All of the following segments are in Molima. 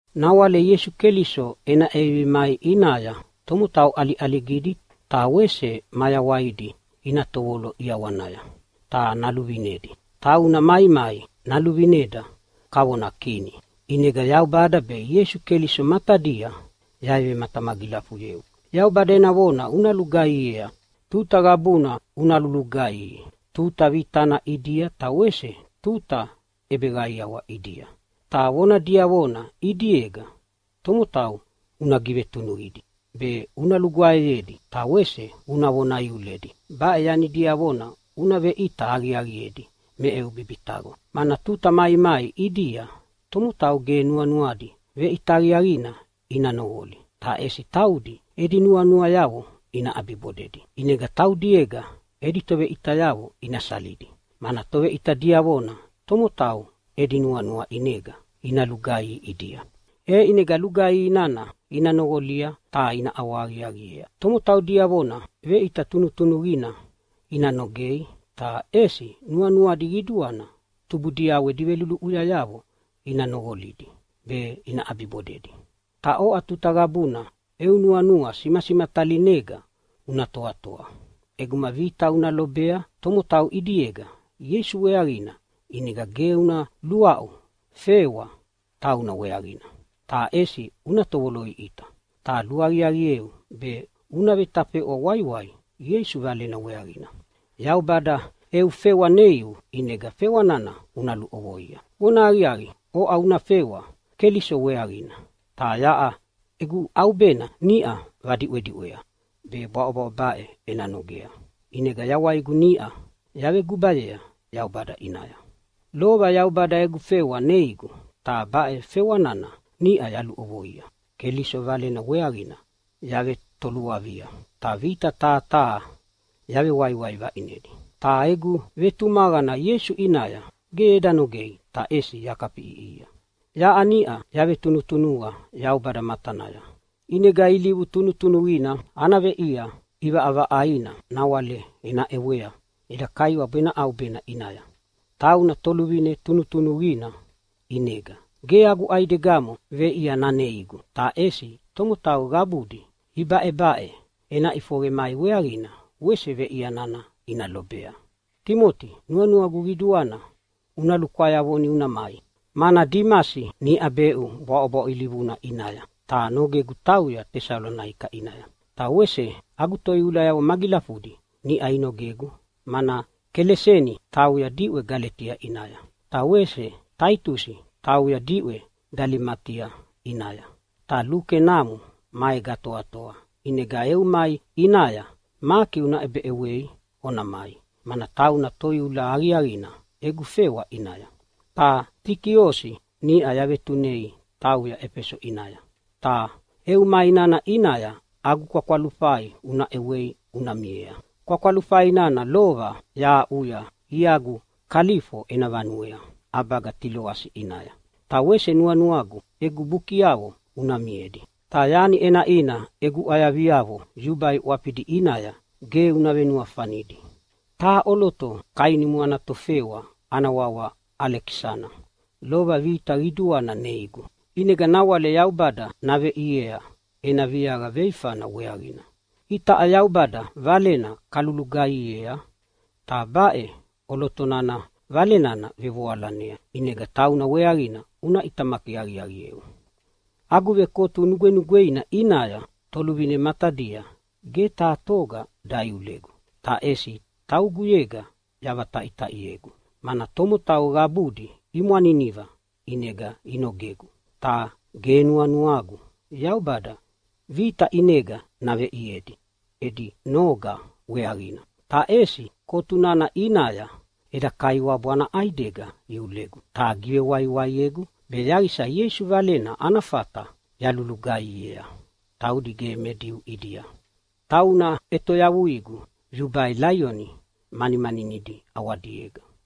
Nawale Ieisu Keliso ena ʼevivi mai ʼinaya tomotau ʼaliʼaligidi ta wese mayawaidi ina tovolo ʼiawanaya ta naluvinedi. Tauna maimai naluvineda kavona Kini. ʼInega Yaubada be Ieisu Keliso matadia yavematamagilafuyeu, Yaubada ena vona una lugaihiea! Tuta qabuna una lulugaihi, tuta vitana ʼidia ta wese tuta ʼebeqaiawa ʼidia. Ta vona diavona ʼidiega tomotau una givetunuqidi be una lugwaeyedi ta wese una vona iuledi. Baʼe yani diavona una veʼita aqiaqiedi me eu bibitaqo. Mana tuta maimai ʼidia tomotau ge nuanuadi veʼita aqiaqina ina noqoli, ta ʼesi taudi edi nuanuayavo ina ʼabibodedi. ʼInega taudiega edi toveʼitayavo ina salidi, mana toveʼita diavona tomotau edi nuanua ʼinega ina lugaihi ʼidia, e ʼinega lugaihi nana ina noqolia ta ina ʼawahaqiaqiea. Tomotau diavona veʼita tunutunuqina ina nogei, ta ʼesi nuanuadi qiduana tubudiavo edi veluluʼuyayavo ina noqolidi be ina ʼabibodedi. Ta oʼa tuta qabuna eu nuanua simasimatalinega una toatoa. ʼEguma vita una lobea tomotau ʼidiega Ieisu weaqina ʼinega ge una luaʼu fewa tauna weaqina, ta ʼesi una tovoloʼiʼita. Ta luaqiaqieu be una vetafeʼwa waiwai Ieisu Valena weaqina. Yaubada eu fewa neiu, ʼinega fewa nana una luʼovoia. Vonahaqiaqi, oʼa una fewa Keliso weaqina, ta yaʼa egu ʼaubena niʼa vadiʼwediʼwea be bwaʼobwaʼo baʼe ena nogea. ʼInega yawaigu niʼa yavegubayea Yaubada ʼinaya. Lova Yaubada egu fewa neigu ta baʼe fewa nana niʼa yaluʼovoia. Keliso Valena weaqina yavetoluavia ta vita taha taha yavewaiwai vaʼinedi. Ta egu vetumaqana Ieisu ʼinaya ge eda nogei, ta ʼesi yakafiʼiʼihia. Yaʼa niʼa yavetunutunuqa Yaubada matanaya, ʼinega ilivu tunutunuqina ana veʼia ʼivaʼavaʼaina nawale ena ʼewea eda Kaiwabu ena ʼaubena ʼinaya. Tauna Toluvine tunutunuqina, ʼinega ge agu ʼaidegamo veʼia naneigu, ta ʼesi tomotau qabudi ibaʼebaʼe ena ʼifoqe mai weaqina wese veʼia nana ina lobea. Timoti, nuanuagu qiduana una lukwayavoni una mai, mana Dimasi niʼa beʼu bwaʼobwaʼo ilivuna ʼinaya ta nogegu tauya Tesalonaika ʼinaya. Ta wese agu toiulayavo magilafudi niʼa inogegu, mana Keleseni tauya diʼwe Galetia ʼinaya, ta wese Taitusi tauya diʼwe Dalematia ʼinaya. Ta Luke namo maega atoatoa. ʼInega eu mai ʼinaya Maki una ʼebeʼewei ona mai, mana tauna toiula aqiaqina egu fewa ʼinaya. Ta Tikiosi niʼa yavetunei tauya Efeso ʼinaya. Ta eu mai nana ʼinaya agu kwakwalufai una ʼewei una miea. Kwakwalufai nana lova yahaʼuya iagu Kalifo ena vanuea ʼabaga Tiloasi ʼinaya. Ta wese nuanuagu egu bukiavo una miedi, ta yani ʼenaʼina egu ʼwayaviavo yubai ʼwafidi ʼinaya ge una venuafanidi. Taha ʼoloto kainumu ana tovefewa ana wawa Alekisana lova vita qiduana neigu. ʼInega nawale Yaubada naveʼiea ena viaqa veifana weaqina. Itaʼa Yaubada Valena kalulugaihiea, ta baʼe ʼoloto nana Vale nana vevoalanea, ʼinega tauna weaqina una ʼitamaki aqiaqieu. Agu vekotu nugwenugweina ʼinaya toluvine matadia ge taha toga daiulegu, ta ʼesi tauguyega yavataʼitaʼiegu, mana tomotau qabudi imwaniniva ʼinega inogegu. Ta ge nuanuagu Yaubada vita ʼinega naveʼiedi edi noga weaqina. Ta ʼesi kotu nana ʼinaya eda Kaiwabu ana ʼaidega iulegu ta givewaiwaiegu, be yaqisa Ieisu Valena ana fata yalugaihiea taudi ge me Diu ʼidia. Tauna ʼetoyavuigu yubai laioni manimaninidi ʼawadiega.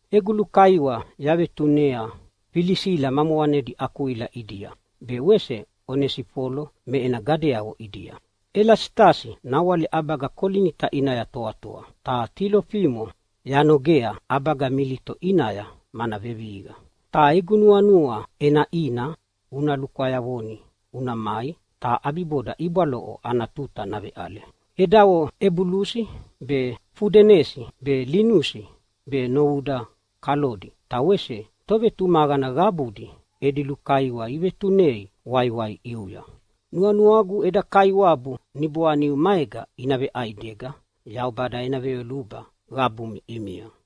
Egu lukaiwa yavetunea Filisila ma moqanedi Akwila ʼidia, be wese Onesifolo me ena gadeavo ʼidia. Elasitasi nawale ʼabaga Kolinita ʼinaya toatoa. Ta Tilofimo yanogea ʼabaga Milito ʼinaya, mana vevihiqa. Ta egu nuanua ʼenaʼina una lukwayavoni una mai ta ʼabiboda ibwaloʼo ana tuta naveʼale. Edavo Ebulusi be, Fudenesi be, Linusi be novuda Kalodi ta wese tovetumaqana qabudi edi lukaiwa ivetunei waiwai ʼiuya. Nuanuagu eda Kaiwabu niboaniu maega ina veʼaidega. Yaubada ena veyoluba qabumi ʼimia.